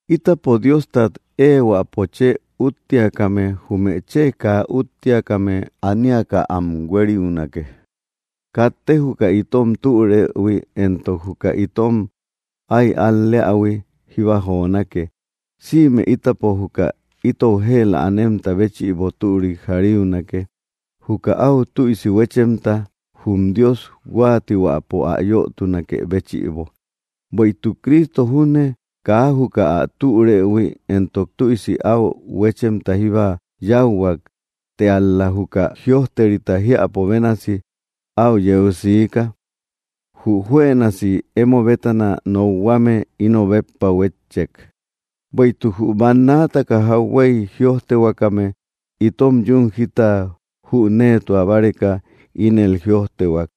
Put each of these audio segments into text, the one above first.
Ítapo Diostat ehuäpo chë üutiakame jume chë kaa üúttiakame aniaka am huériunake; katte juka itom türëhui entok juka itom áy al‑leähui jíba jonake. Sïme ítapo juka itou jëla anemta béchïbo türik jariunake, juka áu tüisi huéchemta, jum Dios huáatihuäpo ä yötunakë béchïbo. Bueïtuk Cristo junne kaa juka ä türëhui entok tüisi áu huéchemta jíba yáuhuak; të ál‑la juka jïojterita jiäpo bénasi áu yeu siika: “Jü juënasi emo bétana nokhuame, íno béppa huétchek.” Bueïtuk jü bannaataka jauhuey jïojtehuakame, itom yún jita jüneetua báreka ínel jïojtehuak,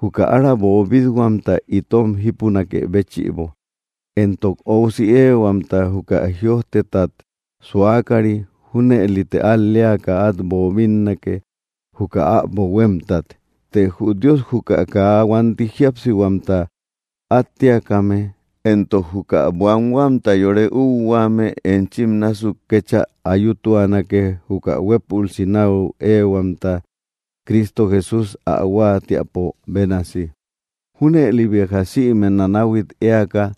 juka ára boobit-huamta itom jípunakë béchïbo, entok óusi éehuamta, juka jïojtetat suakari. Júnëlite al‑leaka át boobinnake, juka äbo huémtat. Të jü Dios juka kaa huanti jíapsihuamta áttiakame entok juka buanhuamta yore úuhuaame enchim násuk kéchä ayutuanake, juka huépülsi náu éehuamta Cristo Jesústa ä huáatiäpo bénasi. Júnëli béja sïme nánahuit éaka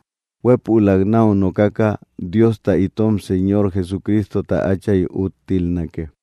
huepülak náu nokaka, Diosta itom Señor Jesucristota Áchay úttilnake.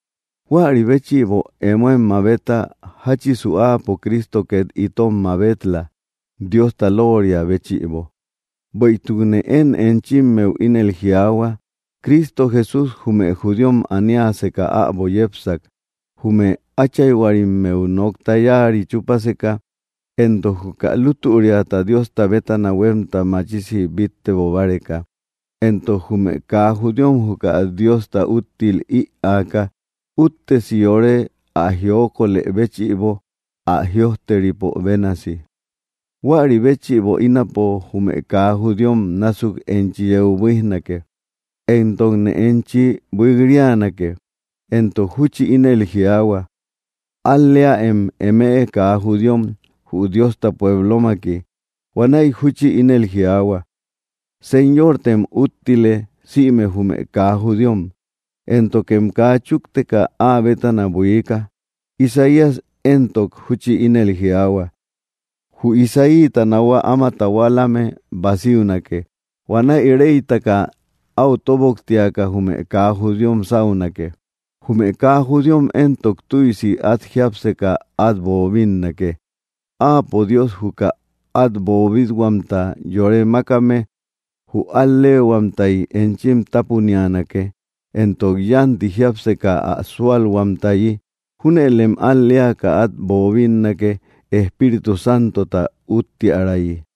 Huäri béchïbo, emoem mabeta, jáchisu Áapo Cristo két itom mabel-la, Diosta lóoria béchïbo. Bueïtukne én enchimmeu ínel jiaahua, Cristo Jesús jume judíom aniaseka äbo yepsak, jume áchayhuarimmeu nokta yáari chúpaseka, entok juka lútüriata Diosta bétana huémta machisi bíttebo báreka. Entok jume kaa judíom juka Diosta úttil ïaaka úttesi yore ä jiokolë béchïbo, ä jïojteripo bénasi: Huäri béchïbo ínapo jume kaa judíom násuk enchi yeu buíjnake, entokne enchi buik‑rianake. Entok júchi ínel jiaahua: Al‑leäem, eme kaa judíom, jü Diosta pueblomaki. Huanäi júchi ínel jiaahua: Señortem úttile, sïme jume kaa judíom, éntokem kaa chúkteka áa bétana buiika. Isaías éntok júchi ínel jiaahua: Jü Isaíta nahua áma tahualame basiunake, huanäi reytaka áu tóboktiaka jume kaa judíom sáunake; jume kaa judíom éntok tüisi át jiápseka át boobinnake. Áapo Dios juka át boobit-huamta yore mákame jü al‑leehuamtay enchim tápunianake, entok yánti jiápseka ä súalhuamtayi. Júnëlem al‑leaka át boobinnake, Espíritu Santota úttiärayi.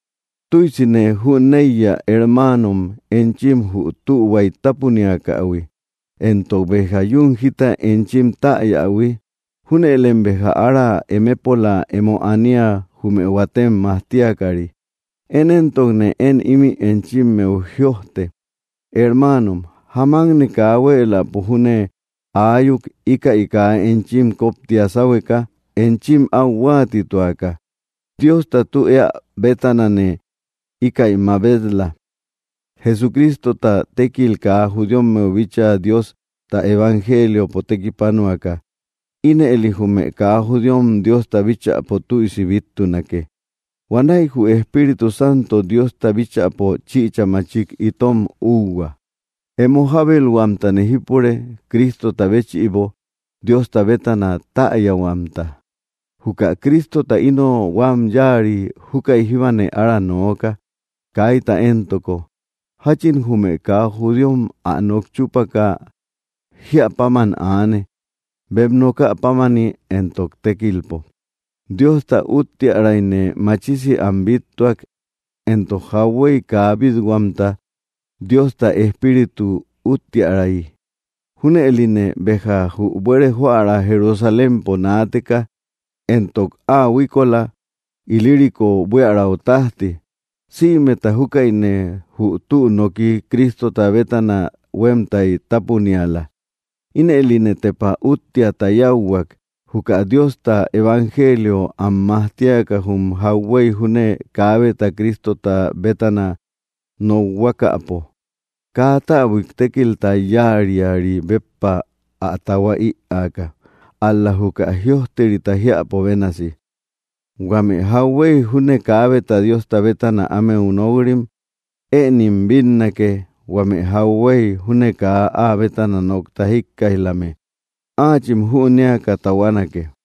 Tüisine jüneiya, hermaanom, enchim jü tühuay tápuniakähui, entok béja yún jita enchim täyähui. Júnëlem béja ára emepola emo ania, jume huatem majtiakari. Én éntokne én ímï enchimmeu jïojte, hermaanom, jamakne kaa huéeläpo júne aayuk, íkäi kaa enchim koptia sáhueka enchim áu huáatituaka, Diosta tü eä bétanane íkäi mabet‑la: Jesucristota tékil kaa judíommeu bíchaa Diosta evangeliopo tekipanuaka. Ínëli jume kaa judíom Diosta bíchäpo tüisi bíttunake. Huanäi jü Espíritu Santo Diosta bíchäpo chichä machik itom úuhua. Emo jábelhuamtane jípure, Cristota béchïbo, Diosta bétana täyahuamta. Juka Cristota íno huam yáari, jukai jíbane ára nooka, kaita entoko, jáchin jume kaa judíom ä nok chúpaka, jíä páman aane, bem nokä pámani entok tékilpo. Diosta úttiärayne machisi am bíttuak, entok jauhuey kaa bít-huamta, Diosta Espíritu úttiäray. Júnëline béja jü buere joära Jerusalémpo naateka, entok áa huíkola Ilírico buiaräu tájti, sïmeta jukaïne jü tü noki Cristota bétana huémtay tápuniala. Ínëline tepa úttiata yáuhuak, juka Diosta evangelio am majtiaka, jum jauhuey júne kaabeta Cristota bétana nokhuakapo, kaa täbuik tékilta yáariari béppa ä tahua ïaaka. Ál‑la juka jïojterita jiäpo bénasi: Huame jauhuey júne kaabeta Diosta bétana ámeu nok‑rim; ënim bínnake, huame jauhuey júne kaa áa bétana nokta jíkkaij‑lame; áachim jünéaka tahuanake.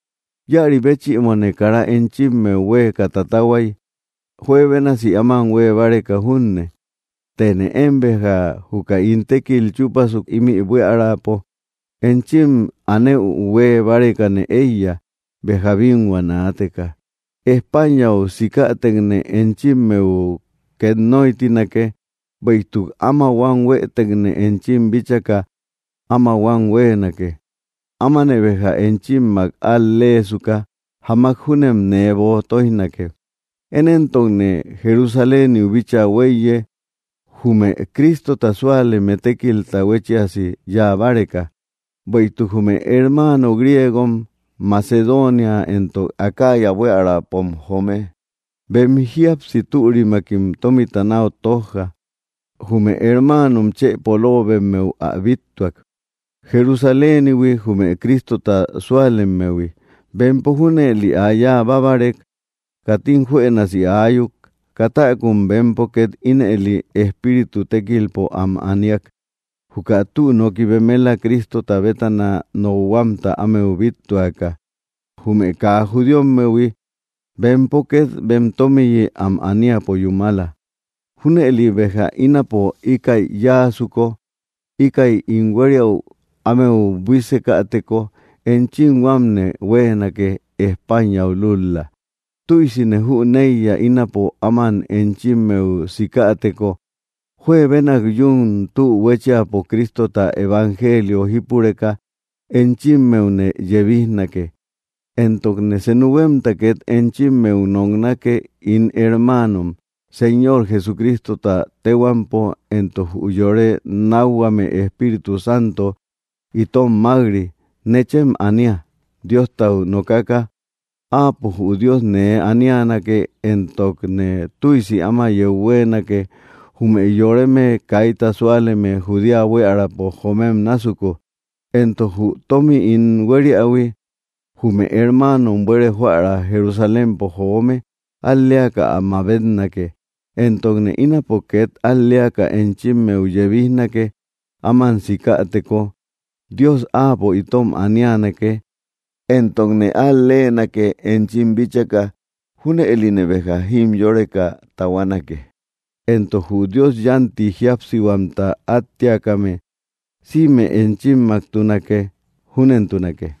Íäri béchïbone kara enchimmeu huéeka tatahuay, juebénasi áman huée báreka junne. Tëne én béja, juka ín tékil chúpasuk ímï buiärapo, enchim anëu huée bárekane éiya, béja bínhua naateka. Españau sikätekne enchimmeu két nóytinake; bueïtuk áma huam huéetekne enchim bíchaka áma huam huéenake. Ámane béja enchimmak al‑leesuka, jamak júnem nee böo tóijnake. Én éntokne Jerusaléniu bíchaa hueiye, jume Cristota súaleme tékilta huéchiasi yáa báreka. Bueïtuk jume hermaano griegom Macedonia entok Acaya buiaräpom joome, bem jíapsi türimakim tómita náu tojja jume hermaano chë polobemmeu ä bíttuak, Jerusalénihui jume Cristota sualemmehui. Bempo junëli ä yáa bábarek, katim juënasi ayuk, katäkum bempo két ínëli espíritu tékilpo am aniak, juka tü noki bemela Cristota bétana nokhuamta ámeu bíttuaka, jume kaa judíommehui; bempo két bem tómiyi am aníapo yúmala. Júnëli béja ínapo íkäi yáasuko, íkäi ín huériäu ámeu buísekäteko, enchim huámne huéenake, Españau lúl‑la. Tüisine jüneiya, ínapo áman enchimmeu sikäteko, juebenak yún tü huéchiapo Cristota evangelio jípureka, enchimmeune yebijnake. Entokne senu huémta két enchimmeu noknake, ín hermaanom, Señor Jesucristota téhuampo entok jü yore nákhuame Espíritu Santo itom mák‑ri, nechem ania, Diostau nokaka. Áapo jü Dios nee anianake, entokne tüisi áma yeu huéenake, jume yoreme kaita súaleme Judea buiärapo joomem násuku, entok jü tómmi ín huériähui, jume hermaanom buere joära Jerusalémpo joome al‑leaka ä mabetnake. Entokne ínapo két al‑leaka enchimmeu yebijnake; áman sikäteko Dios Áapo itom anianake, entokne al-leenake, enchim bíchaka; junëline béja jimyoreka tahuanake. Entok jü Dios yánti jíapsihuamta áttiakame sïme enchimmaktunake. Júnentunake.